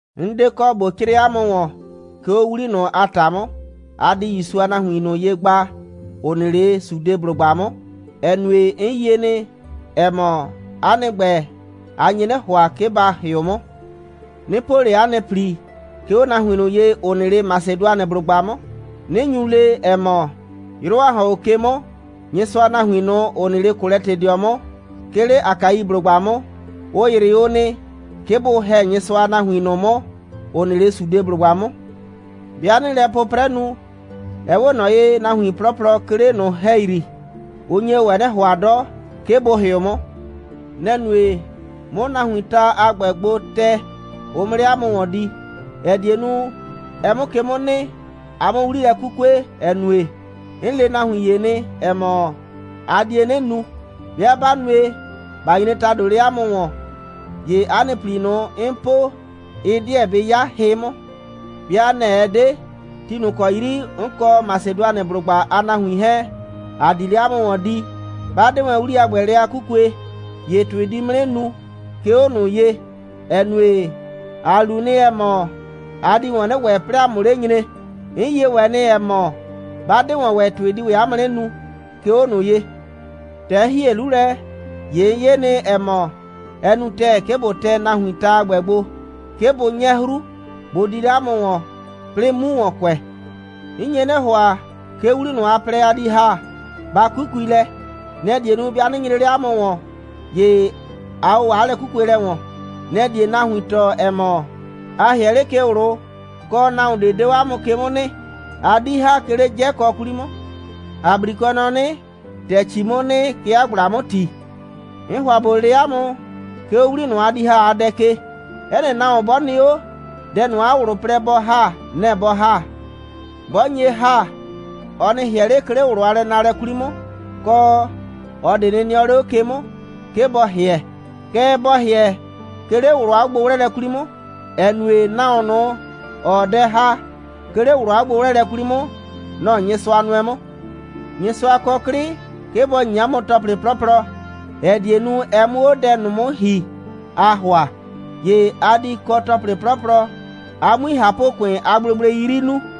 'N 'de kɔ ꞊bo 'crɩɩ 'a mʋ ‑wɔn, 'ke 'o 'wli ꞊nʋ a ‑ta 'mʋ, ‑a di ‑Yusu a nahuin ꞊nʋ ye gba, ‑ʋ nɩ 'le Sudeblʋgba 'mʋ, ‑ɛ nue, 'n yie nɩ, ‑ɛ mɔ, 'a nɩ ‑gbɛ, a nye 'nɩ ‑hʋa, 'ke ba ‑hɩʋ 'mʋ. 'Nɩɩ po 'a nɩ ‑pli, 'ke 'o nahuin ꞊nʋ ye, ‑ʋ nɩ 'le Masɩdʋanɩblʋgba 'mʋ, 'nɩ nyu le, ‑ɛ mɔ: «'Yrʋ, ‑a ‑hɔn 'o ke 'mʋ, Nyɩsʋa a nahuin ꞊nʋ, ‑ʋ nɩ 'le Kolɛtɩdɩɔ 'mʋ, 'ke 'le Akaiblʋgba 'mʋ, ʋ ‑yrɩ o nɩ, 'ke bʋ ‑hɛ Nyɩsʋa a nahuin ꞊nʋ 'mʋ, ‑ʋ nɩ 'le Sudeblʋgba 'mʋ.» 'Bɩa 'nɩɩ lɛ 'pʋprɛ nu, ɛ 'we ꞊nɔ ye, nahuin 'plɔplɔ, 'ke 'le ꞊nʋ ‑hɛyri, ʋ nye ‑wɛ 'nɩ ‑hʋa 'dɔ, 'ke bʋ ‑hɩʋ 'mʋ. Nɛ‑ nue, 'mʋ nahuiin ta a ‑gbɛ gbo tɛ, ʋ 'mʋ 'le 'a mʋ ‑wɔn di, ‑ɛ die nu, ɛ 'mʋ ke 'mʋ nɩ, a 'mʋ 'wli lɛ 'kukue, ‑ɛ nue, 'n le nahuin ‑ye nɩ, ‑ɛ mɔ, a die 'nɩ nu. 'Bɩa 'ba nue, ꞊ba nyre ‑tado 'le 'a mʋ ‑wɔn, ‑ye 'a nɩ ‑pli ꞊nʋ, 'n po, ɩ 'deɛ bɩ 'ya hɩ 'mʋ. 'Bɩa nɛ‑ ɛ 'de, ti ꞊nʋ ‑kɔ 'yri 'n kɔ Masɩdʋanɩblʋgba a nahuin 'hɛɛn, ‑a di 'le 'a mʋ ‑wɔn di, 'ba 'de wɛn 'wli a ‑gbɛ lɛ a 'kukue, ‑ye ‑tʋɩ di 'mʋ 'nɩ nu, 'ke 'o ꞊nʋ ye, ‑ɛ nue, ‑a lu nɩ, ‑ɛ mɔ, a di ‑wɔn 'nɩ ‑wɛ, 'plɩɩ ‑a 'mʋ 'le nyre. 'N yie ‑wɛ nɩ, ‑ɛ mɔ, 'ba 'de ‑wɔn ‑wɛ, ‑tʋɩ di ‑wɛ 'a mʋ 'nɩ nu, 'ke 'o ꞊nʋ ye. ‑Tɛ 'n ‑hie 'lu lɛ, ‑ye 'n 'ye nɩ, ‑ɛ mɔ, ɛ nu ‑tɛɛ, 'ke ꞊bo tɛ nahuiin ta a ‑gbɛ gbo, 'ke bʋ 'nyɛ 'hru, bʋ di 'le 'a mʋ ‑wɔn, 'plɩɩ 'mu ‑wɔn kʋɛ. 'N nye 'nɩ ‑hʋa, 'ke 'wli ꞊nʋ, a plɛ, a di ‑ha, ba 'kukui lɛ. Nɛ‑ die nu, 'bɩa 'nɩ nyre 'le 'a mʋ ‑wɔn, ‑ye a ‑wɔ 'a lɛ'kukuelɛ ‑wɔn. Nɛ‑ die nahuin tɔɔ, ‑ɛ mɔ, a ‑hɩɛ 'le ke ꞊wlʋ, kɔ, nahuon ꞊de 'de 'o 'a mʋ ke 'mʋ nɩ, 'a 'di ‑ha, 'ke 'le 'jɛkɔ 'kwli 'mʋ. ‑A 'brikʋɛ nɔ 'nɩ: «‑Tɛ ‑cii 'mʋ nɩ, kɛ 'a ꞊gblaa 'mʋ ‑ti.» 'N ‑hʋa ꞊bo le 'a mʋ, 'ke 'o 'wli ꞊nʋ, a di ‑ha a dɛ ke: 'Ɛ nɩ nahuon 'bɔ nɩ 'o, dɛ ꞊nʋ, 'a ꞊wlʋ plɛ bɔ ‑ha, nɛ‑ bɔ ‑ha. 'Bɔ nye ‑ha, ɔ nɩ ‑hɩɛ 'le, 'ke 'le ꞊wlʋ a lɛnaalɛ 'kwli 'mʋ, kɔ, ꞊ɔ ꞊de nɩ nɩɔ 'le 'o ke 'mʋ, 'ke bɔ ‑hɩɛ. Kɛɛ, bɔ ‑hɩɛ, 'ke 'le ꞊wlʋ a 'ogbo'wlɛɛlɛ 'kwli 'mʋ, ‑ɛ nue, nahuon ꞊nʋ, ‑ɔɔ dɛ ‑ha, 'ke 'le ꞊wlʋ a 'ogbo'wlɛɛlɛ 'kwli 'mʋ, nɔ‑ Nyɩsʋa nʋɛ 'mʋ. Nyɩsʋa kɔ 'klɩ, 'ke bɔ ‑nyi 'a mʋ ‑tɔplɩ 'plɔplɔ, ‑ɛ die nu, ɛ 'mʋ 'o dɛ ꞊nʋ 'mʋ ‑hi, aa ‑hʋa. ‑Ye a di kɔ ‑tɔplɩ 'plɔplɔ, a 'mui ꞊hapʋ‑kʋɩn a gblegblei 'yri nuu,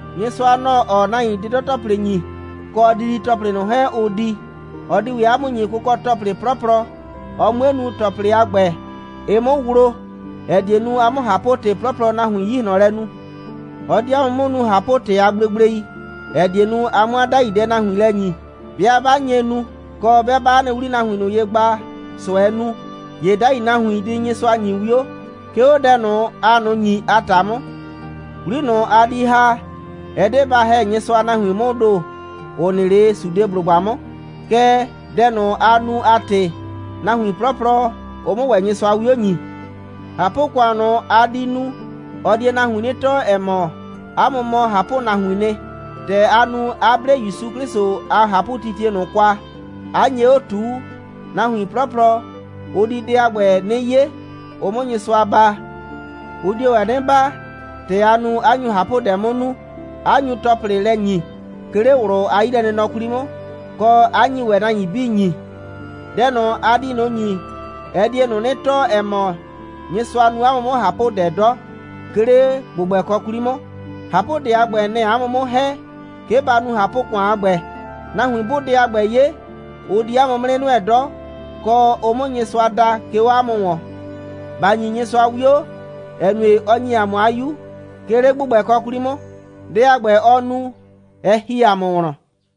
Nyɩsʋa, nɔ‑ɔ nahuin 'dɩdɔ‑tɔplɩ ‑nyi, kɔ didi‑tɔplɩ ꞊nʋ 'hɛɛn, ʋʋ di. Ɔ di ‑wɛ 'a mʋ ‑nyi kʋkɔ‑tɔplɩ 'plɔplɔ, ɔ 'mue nu, ‑tɔplɩ a ‑gbɛ, ɩ 'mʋ wlo, ‑ɛ die nu, a 'mʋ ꞊hapʋ‑tɩ 'plɔplɔ nahuin 'yi ꞊hlɔn lɛ nu. Ɔ di 'a mʋ 'mʋ nu ꞊hapʋ‑tɩ a gblegblei, ‑ɛ die nu, a 'mʋ 'a 'dai dɛ nahuin lɛ ‑nyi. 'Bɩa 'ba nye nu, kɔ, 'bɩa ꞊baa 'a nɩ 'wli nahuin ꞊nʋ ye gba, ꞊sʋɛɛ nu, ‑ye 'dai nahuin di Nyɩsʋa ‑nyi 'wio, 'ke 'o dɛ ꞊nʋ, aa ꞊nʋ ‑nyi a ‑ta 'mʋ. 'Wli ꞊nʋ, a di ‑ha, ɛ 'de ba ‑hɛ Nyɩsʋa a nahuin 'mʋʋ ‑do, ‑ʋ nɩ 'le Sudeblʋgba 'mʋ, kɛɛ, dɛ ꞊nʋ, aa nu a ‑tɩ, nahuin 'plɔplɔ, ʋ 'mʋ ‑wɛ Nyɩsʋa 'wio ‑nyi. ꞊Hapʋ‑kʋan ꞊nʋ, a di nu, ɔ die nahuin 'nɩ tɔɔ, ‑ɛ mɔ, 'a mʋ mɔ ꞊hapʋnahuiin nɩ. ‑Tɛ a nu, 'a 'ble ‑Yusu 'Klɩsʋ a ꞊hapʋtitie ꞊nʋ kwa, 'a nye 'o ꞊tuu, nahuin 'plɔplɔ, ʋ di dɛ a ‑gbɛ 'nɩ 'ye, ʋ 'mʋ Nyɩsʋa baa. Ʋ dio ‑wɛ 'nɩ baa, ‑tɛ aa nu, 'a nyu ꞊hapʋdɛ 'mʋ nu, 'a nyu ‑tɔplɩ lɛ ‑nyi, 'ke 'le ꞊wlʋ a 'yilɛnɩnɔ 'kwli 'mʋ, kɔ, 'a nyi ‑wɛ nahuin 'bii ‑nyi. Dɛ ꞊nʋ, a di ꞊nʋ ‑nyi, ɛ die ꞊nʋ 'nɩ tɔɔ, ‑ɛ mɔ, Nyɩsʋa nu 'a mʋ 'mʋ ꞊hapʋdɛ 'dɔ, 'ke 'le ‑gbʋgbɛkɔ 'kwli 'mʋ. ꞊Hapʋdɛ a ‑gbɛ, nɛ‑ɛ 'a mʋ 'mʋ ‑hɛ, 'ke ba nu ꞊hapʋ‑kʋan a ‑gbɛ. Nahuin 'bʋʋ dɛ a ‑gbɛ 'ye, ʋ di 'a mʋ 'mʋ 'nɩ nʋɛ 'dɔ, kɔ, ʋ 'mʋ Nyɩsʋa da, 'ke 'o 'a mʋ ‑wɔn. ‑Ba ‑nyi Nyɩsʋa 'wio, ‑ɛ nue, ɔ ‑nyi ‑a mʋ 'a 'Yu, 'ke 'le ‑gbʋgbɛkɔ 'kwli 'mʋ. Dɛ a ‑gbɛ, ɔ nu, ɛ ‑hi ‑a mʋ wlɔn.